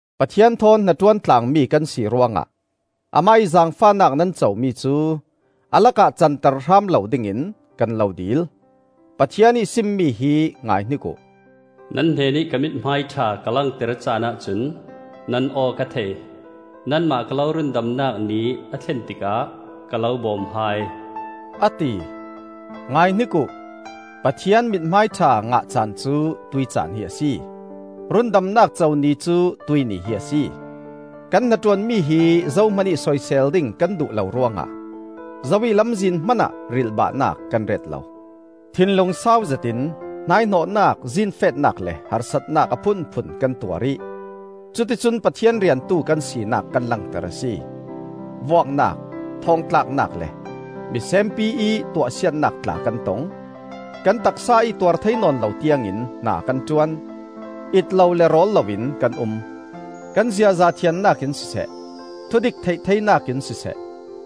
Pathian thawn hnaṭuan tlaangmi kan si ruangah Amah ih zaangfahnak nan comi cu a lakah canter hram lo dingin kan lo dil. Pathian ih simmi hi ngaihnik uh: “Nan hnenih ka mithmai ṭha ka langter caanah cun nan aw ka thei; Nanmah ka lo rundamnak ni a thlen tikah ka lo bawm hai,” a ti. Ngaihnik uh! Pathian mithmai ṭha ngah caan cu tuih caan hi a si; rundamnak co ni cu tuih ni hi a si. Kan hnaṭuanmi hi zohmanih soisel ding kan duh lo ruangah zo ih lamzin hmanah rilhbahnak kan ret lo. Thinlung sau zetin hnaihnawhnak, zinfetnak le harsatnak a phunphun kan tuar ih cuticun Pathian riantu kan sinak kan langter a si. Vuaknak, thawngtlaknak le misenpi ih tuahsiatnak tla kan tong. Kan taksa ih tuar thei nawn lo tiangin hna kan ṭuan; it lo le rawl loin kan um. Kan ziaza thiannak in siseh, thudik theih theinak in siseh,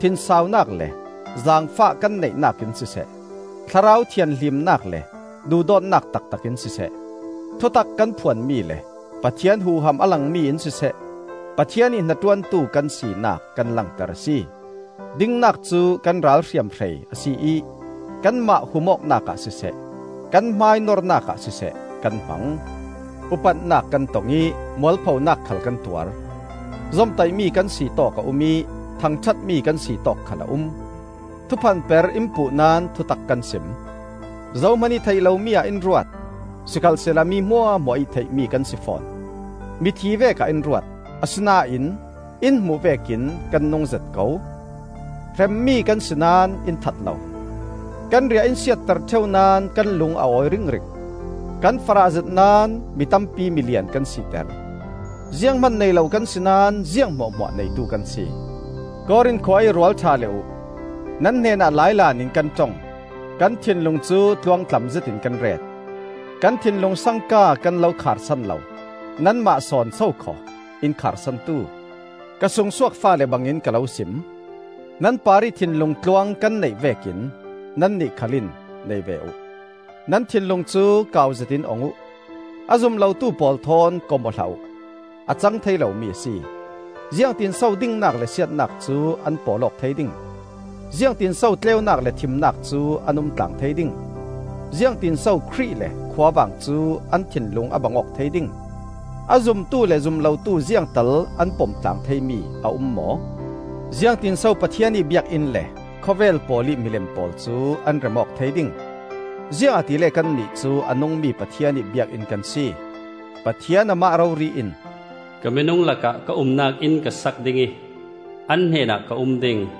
thinsaunak le zaangfah kan neihnak in siseh, thlarau thianhlimnak le duhdawtnak taktak in siseh, thutak kan phuanmi le Pathian huham a langmi in siseh, Pathian ih hnaṭuantu kan sinak kan langter a si. Dingnak cu kan ral hriamhrei a si ih kanmah hum awknak ah siseh, kan hmai nornak ah siseh kan hmang; upatnak kan tong ih mualphonak khal kan tuar; zomtaihmi kan si tawk a um ih thangṭhatmi kan si tawk khal a um. Thuphanper in puh naón thutak kan sim. Zohman ih theih lomi ah in ruat, sikhalsehla mi hmuahhmuah ih theihmi kan si fawn. Mithi vekah in ruat, asinain in hmuh vekin kan nungzet ko. Hremmi kan si naón in that lo. Kan riah in siatter ṭheu naón kan lung a awi ringring. Kan farahzet naón mi tampi milian kan siter. Zianghman nei lo kan si naón ziang hmuahhmuah neitu kan si. Korin khua ih rualṭha le uh, nan hnenah lailan in kan ṭong; kan thinlung cu tluangtlam zetin kan ret. Kan thinlung sangka kan lo kharsan lo; nanmah sawn sokhaw in kharsantu! Ka sungsuak faale bangin ka lo sim. Nan parih thinlung tluang kan neih vekin nannih khal in nei ve uh. Nan thinlung cu kauzetin ong uh! A zum lotu pawl thawn kom-aw hlah uh. A cang thei lomi a si. Ziangtin so dingnak le siatnak cu an pawl awk thei ding? Ziangtin so tleunak le thimnak cu an umtlang thei ding? Ziangtin so Khrih le khuavang cu an thinlung a bang awk thei ding? A zumtu le zum lotu ziangtal an pomtlaang theimi a um maw? Ziangtin so Pathian ih biakinn le khawvel pawl ih milem pawl cu an rem awk thei ding? Ziangahtile kannih cu a nungmi Pathian ih biakinn kan si. Pathian amah rori in: “Ka minung lakah ka umnak inn ka sak ding ih an hnenah ka um ding.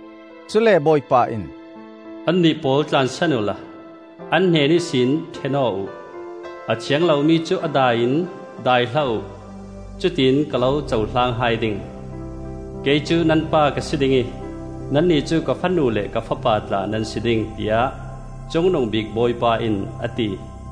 Cule Bawipa in: “Annih pawl tlansan uhla, an hnen ihsin ṭhen aw uh. A thiang lomi cu a dai in dai hlah uh; Cutin ka lo cohlang hai ding. Kei cu nan Pa ka si ding ih, Nannih cu ka fanu le ka fapa tla nan si ding, tiah Cungnungbik Bawipa in a ti,”